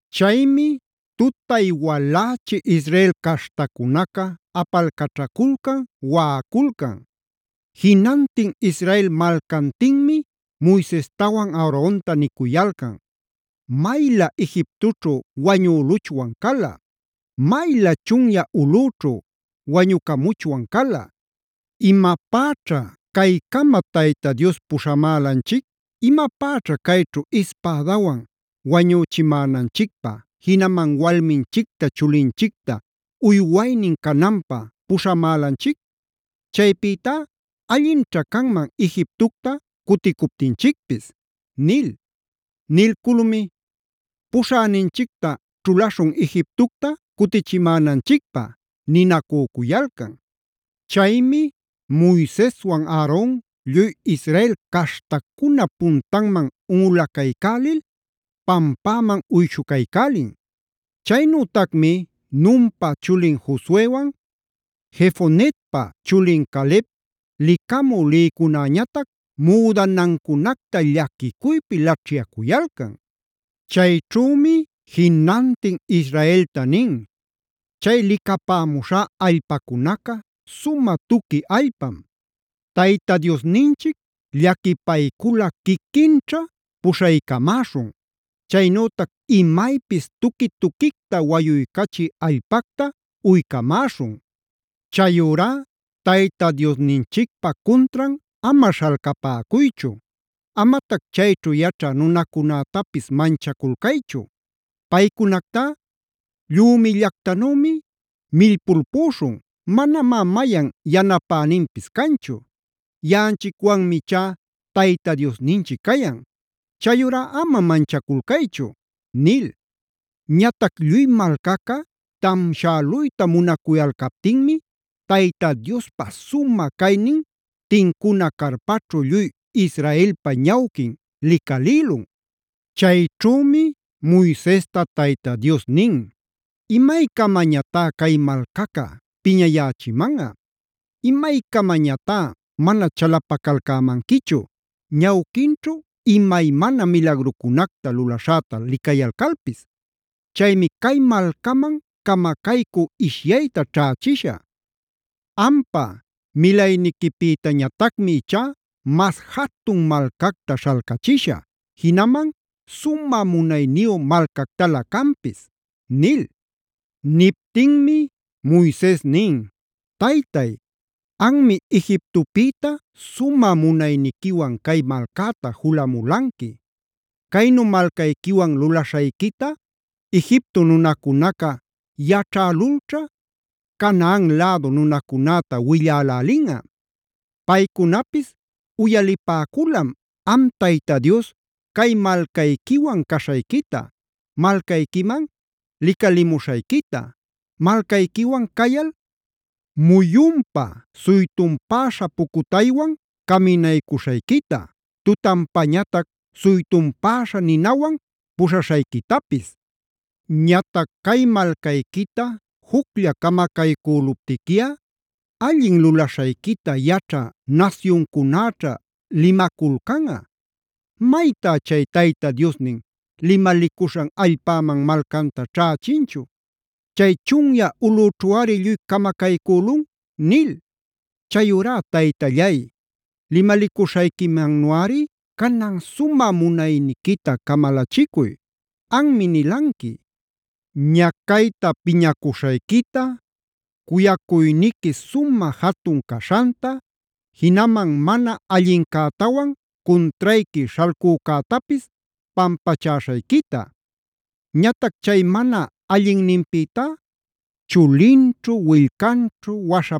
Chaymi tutay-walächi Israel caśhtacunaca apalcaćhaculcan, waꞌaculcan. Jinantin Israel malcantinmi Moisestawan Aaronta nicuyalcan: “¡Maylä Egiptoćhu wañüluchwan cala! ¡Maylä chunyä ulꞌüćhu wañucamuchwan cala! ¿Imapäćha caycama Tayta Dios puśhamälanchic? ¿Imapäćha cayćhu ispädawan wañüchimänanchicpä, jinaman walminchicta, chulinchicta uywaynin cananpä puśhamälanchic? Chaypïtá allinćha canman Egiptocta cuticuptinchicpis” nil. Nilculmi: “Puśhäninchicta ćhulaśhun Egiptocta cutichimänanchicpä” ninacücuyalcan. Chaymi Moiseswan Aaron lluy Israel caśhtacunap puntanman unꞌulacaycälil pampäman uyshucaycälin. Chaynütacmi Nunpa chulin Josuewan, Jefonep chulin Caleb licamü lïcunaca müdanancunacta llaquicuypi laćhyacuyalcan. Chayćhümi jinantin Israelta nin: “Chay licapämuśhá allpacunaca sumä tuqui allpam. Tayta Diosninchic llaquipayculꞌa quiquinćha puśhaycamäśhun. Chaynütac imaypis tuqui-tuquicta wayuycachï allpacta uycamäśhun. Chayurá Tayta Diosninchicpä cuntran ama śhalcapäcuychu.b Amatac chayćhu yaćhä nunacunätapis manchaculcaychu. Paycunactá llümillactanümia millpulpüśhun; manamá mayan yanapäninpis canchu. Yaꞌanchicwanmi ichá Tayta Diosninchic cayan. Chayurá amari manchaculcaychu” nil. Ñatac lluy malcaca tamshäluyta munacuyalcaptinmi Tayta Diospa sumä caynin tincuna carpaćhu lluy Israelpa ñawquin licalïlun. Chayćhümi Moisesta Tayta Dios nin: “¿Imaycamañatá cay malcaca piñayächimanꞌa? ¿Imaycamañatá mana chalapacalcämanquichu ñawquinćhu imaymana milagrucunacta lulaśhäta licayalcalpis? Chaymi cay malcaman camacaycü ishyayta ćhächishä. Ampa milayniquipïtañatacmi ichá mas jatun malcacta śhalcachishä, jinaman sumä munayniyu malcactalä canpis” nil. Niptinmi Moises nin: “Taytay, anmi Egiptopïta sumä munayniquiwan cay malcäta julamulanqui. Caynu malcayquiwan lulaśhayquita Egipto nunacunaca yaćhälulćha, Canaan lädu nunacunäta willälälinꞌa. Paycunapis uyalipäculam, am Tayta Dios cay malcayquiwan caśhayquita, malcayquiman licalimuśhayquita, malcayquiwan cayal muyunpa suytunpäśha pucutaywan caminaycuśhayquita, tutanpañatac suytunpäśha ninawan puśhaśhayquitapis. Ñatac cay malcayquita juclla camacaycüluptiquiꞌa allin lulaśhayquita yaćhä nasyuncunäćhá limaculcanꞌa: ‘Maytá chay Tayta Diosnin limalicuśhan allpäman malcanta ćhächinchu. Chay chunyä ulꞌućhuꞌari lluy camacaycülun’ nil. Chayurá Taytallay, limalicuśhayquimannuꞌari canan sumä munayniquita camalachicuy. Anmi nilanqui, ñacayta piñacuśhayquita, cuyacuyniqui sumä jatun caśhanta, jinaman mana allincätawan cuntrayqui śhalcücätapis pampachäśhayquita. Ñatac chay mana allinninpïtá chulinćhu, willcanćhu,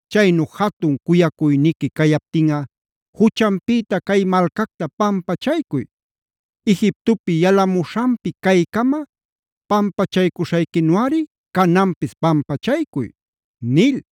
Chaynu jatun cuyacuyniqui cayaptinꞌa juchanpïta cay malcacta pampachaycuy; Egiptopi yalamuśhanpi caycama pampachaycuśhayquinuꞌari cananpis pampachaycuy”e nil.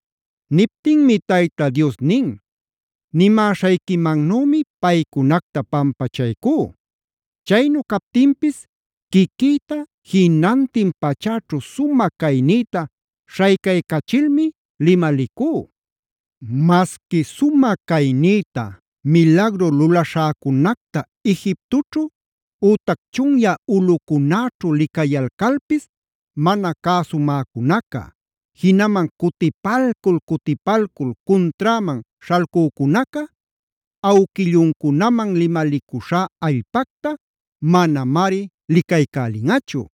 Niptinmi Tayta Dios nin: “Nimäśhayquimannümi paycunacta pampachaycú. Chaynu captinpis quiquïta, jinantin pachäćhu sumä caynïta śhaycaycachilmi limalicú: Masqui sumä caynïta, milagru lulaśhäcunacta Egiptoćhu ütac chunyä ulꞌucunäćhu licayalcalpis mana cäsumäcunaca, jinaman cutipalcul-cutipalcul cunträman śhalcücunaca, awquilluncunaman limalicuśhá allpacta manamari licaycälinꞌachu.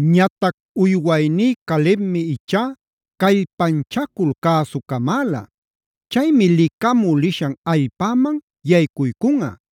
Ñatac uywayní Calebmi ichá callpanchacul cäsucamäla. Chaymi licamü lishan allpäman yaycuycunꞌa;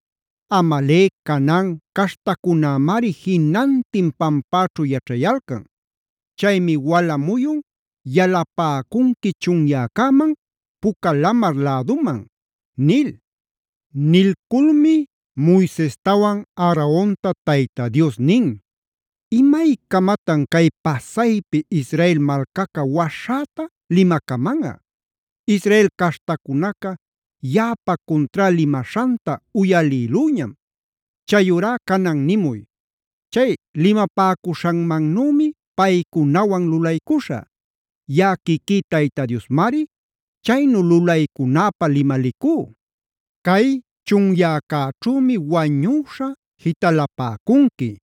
Amalec, Canaan caśhtacunämari jinantin pampäćhu yaćhayalcan. Chaymi wala muyun yalapäcunqui chunyäcäman Puca lamar läduman” nil. Nilculmi Moisestawan Aaronta Tayta Dios nin: “¿Imaycamatan cay pasaypi Israel malcaca waśhäta limacamanꞌa? Israel caśhtacunaca yaꞌapa cunträ limaśhanta uyalïlüñam. Chayurá canan nimuy: ‘Chay limapäcuśhanmannümi paycunawan lulaycuśhä. Yaꞌa quiquí Tayta Diosmari chaynu lulaycunäpä limalicú. Cay chunyäcäćhümi wañüśha jitalapäcunqui.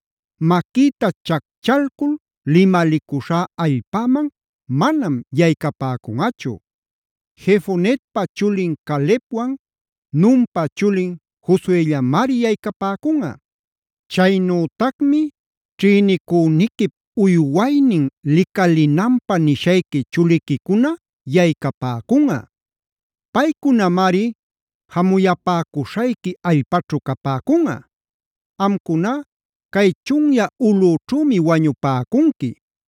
maquïta chacchalcul limalicuśhá allpäman manam yaycapäcunꞌachu. Jefoneppa chulin Calebwan, Nunpa chulin Josuellamari yaycapäcunꞌa. Chaynütacmi ćhïnicüniquip uywaynin licalinanpä nishayqui chuliquicuna yaycapäcunꞌa. Paycunamari jamuyapäcuśhayqui allpaćhu capäcunꞌa. Amcuná cay chunyä ulꞌućhümi wañupäcunqui.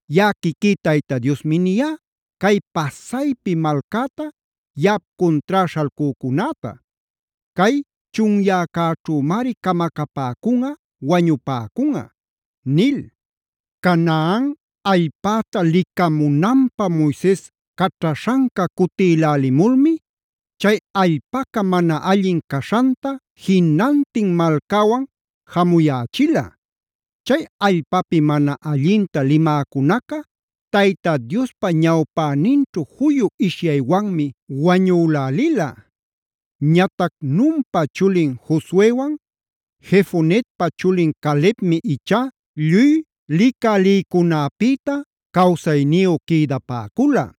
Yaꞌa quiquí Tayta Diosmi niyá, cay pasaypi malcäta yaꞌap cuntrá śhalcücunäta; cay chunyäcäćhümari camacapäcunꞌa, wañupäcunꞌa’” nil. Canaan allpäta licamunanpä Moises caćhaśhanca cutilälimulmi chay allpaca mana allin caśhanta jinantin malcäwan jamuyächila. Chay allpapi mana allinta limäcunaca Tayta Diospa ñawpäninćhu juyu ishyaywanmi wañülälila. Ñatac Nunpa chulin Josuewan Jefonep chulin Calebmi ichá lluy licä lïcunäpïta cawsayniyu quïdapäcula.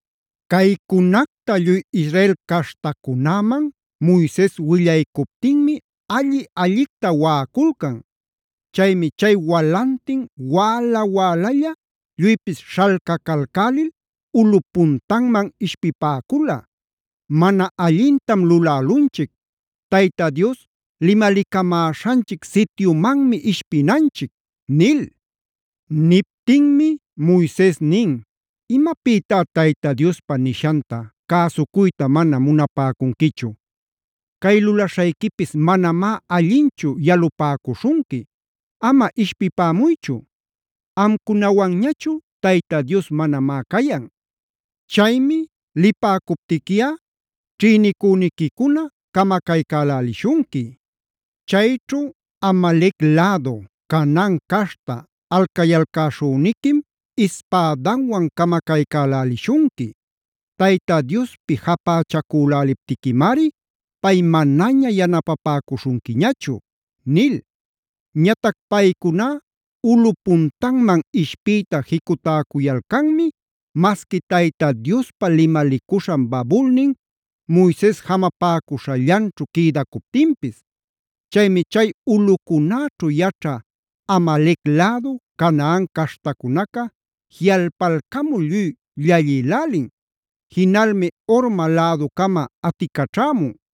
Caycunacta lluy Israel caśhtacunäman Moises willaycuptinmi alli-allicta waꞌaculcan. Chaymi chay walantin wäla-wälalla lluypis śhalcacalcälil ulꞌup puntanman ishpipäcula: “Mana allintam lulälunchic. Tayta Dios limalicamäśhanchic sityumanmi ishpinanchic” nil. Niptinmi Moises nin: “¿Imapïtá Tayta Diospa nishanta cäsucuyta mana munapäcunquichu? ¡Cay lulaśhayquipis manamá allinchu yalupäcuśhunqui! Ama ishpipämuychu. Amcunawanñachu Tayta Dios manamá cayan. Chaymi lipäcuptiquiꞌa ćhïnicüniquicuna camacaycälälishunqui. Chayćhu Amalec lädu, Canaan caśhta alcayalcäśhüniquim ispädanwan camacaycälälishunqui. Tayta Diospi japächacüläliptiquimari pay manaña yanapapäcuśhunquiñachu” nil. Ñatac paycuná ulꞌu puntanman ishpiyta jicutäcuyalcanmi, masqui Tayta Diospa limalicuśhan babulnin, Moises jamapäcuśhallanćhu quïdacuptinpis. Chaymi chay ulꞌucunäćhu yaćhä Amalec lädu, Canaan caśhtacunaca jiꞌalpalcamul lluy llallïlälin. Jinalmi Horma läducama aticaćhämun.